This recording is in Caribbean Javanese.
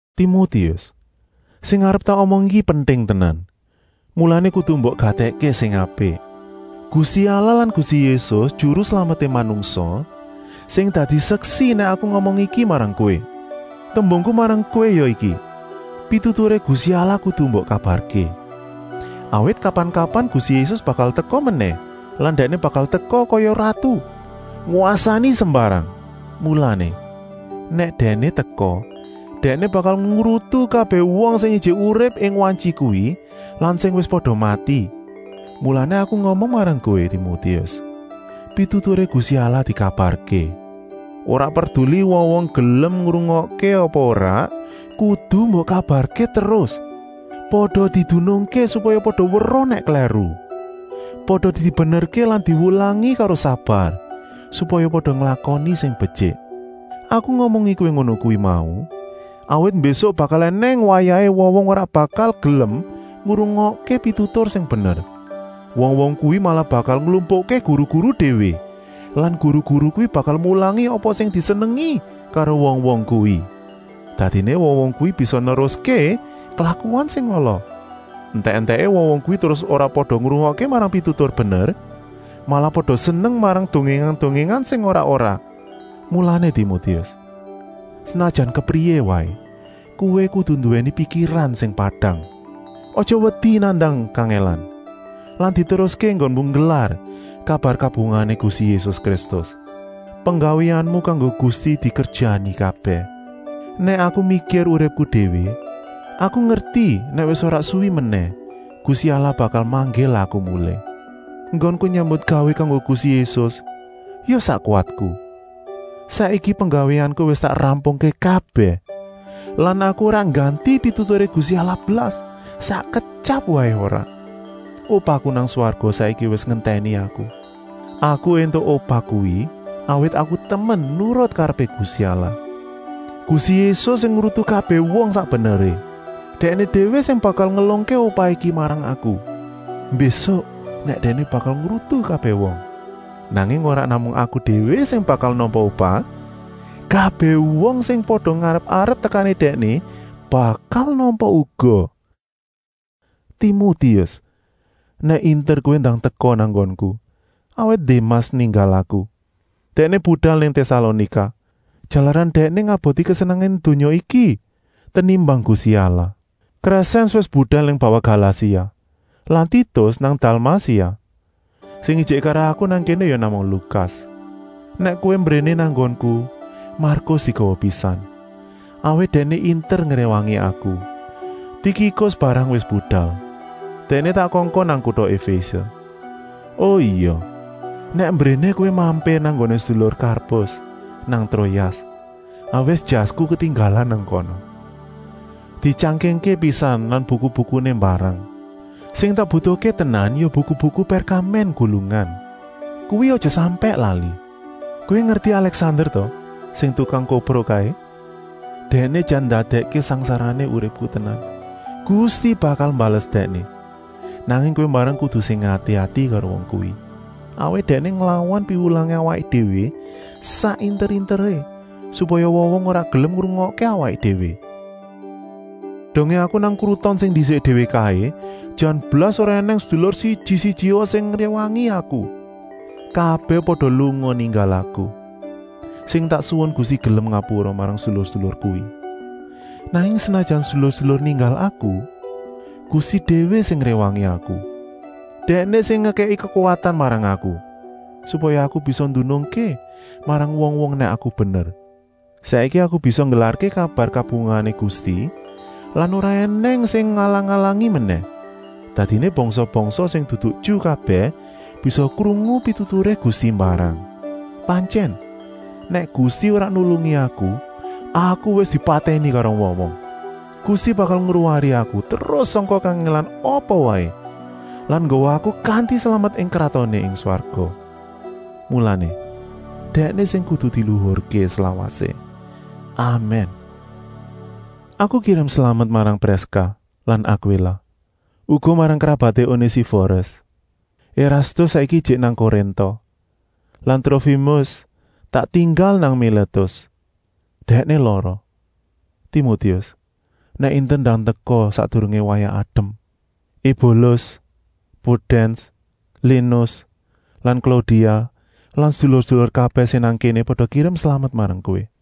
Timotius, sing arep tak omong iki penting tenan, mulané kudu mbok gatèkké sing apik. Gusti Allah lan Gusti Yésus, Juru Slameté manungsa, sing dadi seksi nèk aku ngomong iki marang kowé. Tembungku marang kowé ya iki: pituturé Gusti Allah kudu mbok kabarké. Awit kapan-kapan Gusti Yésus bakal teka menèh lan Dèkné bakal teka kaya ratu, ngwasani sembarang. Mulané, nèk Dèkné teka, Dèkné bakal ngrutu kabèh wong sing ijik urip ing wantyi kuwi lan sing wis pada mati. Mulané aku ngomong marang kowé Timotius: pituturé Gusti Allah dikabarké. Ora perduli wong-wong gelem ngrungokké apa ora, kudu mbok kabarké terus. Pada didunungké, supaya pada weruh nèk klèru. Pada dibenerké lan diwulangi karo sabar, supaya pada nglakoni sing betyik. Aku ngomongi kowé ngono kuwi mau, awit mbésuk bakal ènèng wayahé wong-wong ora bakal gelem ngrungokké pitutur sing bener. Wong-wong kuwi malah bakal nglumpukké guru-guru déwé lan guru-guru kuwi bakal mulangi apa sing disenengi karo wong-wong kuwi. Dadiné wong-wong kuwi bisa neruské klakuané sing ala. Entèk-entèké wong-wong kuwi terus ora pada ngrungokké marang pitutur bener, malah pada seneng marang dongèngan-dongèngan sing ora-ora. Mulané Timotius, senajan kepriyé waé, kowé kudu nduwèni pikiran sing padang. Aja wedi nandang kangèlan lan diteruské enggonmu nggelar kabar kabungahané Gusti Yésus Kristus. Penggawéanmu kanggo Gusti dikerjani kabèh. Nèk aku mikir uripku déwé, aku ngerti nèk wis ora suwi menèh Gusti Allah bakal manggil aku mulih. Enggonku nyambutgawé kanggo Gusti Yésus ya sak kuwatku. Saiki penggawéanku wis tak rampungké kabèh lan aku ora ngganti pituturé Gusti Allah blas, sak ketyap waé ora. Upahku nang swarga saiki wis ngentèni aku. Aku éntuk upah kuwi, awit aku temen nurut karepé Gusti Allah. Gusti Yésus sing ngrutu kabèh wong sak beneré, Dèkné déwé sing bakal ngelungké upah iki marang aku, mbésuk nèk Dèkné bakal ngrutu kabèh wong. Nanging ora namung aku déwé sing bakal nampa upah, kabèh wong sing pada ngarep-arep tekané Dèkné bakal nampa uga. Timotius, nèk inter kowé ndang teka nang nggonku, awit Démas ninggal aku. Dèkné budal nang Tèsalonika, jalaran dèkné ngeboti kesenengané donya iki tenimbang Gusti Allah. Krèsèns wis budal nang bawah Galasia lan Titus nang Dalmasia. Sing ijik karo aku nang kéné ya namung Lukas. Nèk kowé mbréné nang nggonku, Markus digawa pisan, awit dèkné inter ngréwangi aku. Tikikus mbarang wis budal. Dèkné tak kongkon nang kuta Efése. O ya, nèk mbréné kowé mampir nang nggoné sedulur Karpus nang Troas, awit jasku ketinggalan nang kana. Dityangkingké pisan lan buku-bukuné mbarang. Sing tak butuhké tenan ya buku-buku pèrkamèn gulungan. Kuwi aja sampèk lali. Kowé ngerti Alèksander ta, sing tukang kopro kaé, dèkné jan ndadèkké sangsarané uripku tenan. Gusti bakal mbales dèkné. Nanging kowé mbarang kudu sing ati-ati karo wong kuwi, awit dèkné nglawan piwulangé awaké déwé sak inter-interé, supaya wong-wong ora gelem ngrungokké awaké déwé. Dongé aku nang kruton sing ndisik déwé kaé jan blas ora ènèng sedulur siji-sijia sing ngréwangi aku. Kabèh pada lunga ninggal aku. Sing tak suwun Gusti gelem ngapura marang sedulur-sedulur kuwi. Nanging senajan sedulur-sedulur ninggal aku, Gusti déwé sing ngréwangi aku. Dèkné sing ngekèki kekuwatan marang aku, supaya aku bisa ndunungké marang wong-wong nèk aku bener. Saiki aku bisa nggelarké kabar kabungahané Gusti lan ora ènèng sing ngalang-alangi menèh. Dadiné bangsa-bangsa sing dudu Ju kabèh bisa krungu pituturé Gusti mbarang. Pantyèn, nèk Gusti ora nulungi aku, aku wis dipatèni karo wong-wong. Gusti bakal ngluwari aku terus sangka kangèlan apa waé lan nggawa aku kanti slamet ing kratoné ing swarga. Mulané, Dèkné sing kudu diluhurké slawasé. Amèn. Aku kirim slamet marang Priska lan Akwila. Uga marang krabaté Onésiforis. Erastus saiki ijik nang Korinta lan Trofimus tak tinggal nang Milétus. Dèkné lara. Timotius, nèk inter ndang teka sakdurungé wayah adem. Ebulus, Pudèns, Linus lan Klaudia lan sedulur-sedulur kabèh sing nang kéné pada kirim slamet marang kowé.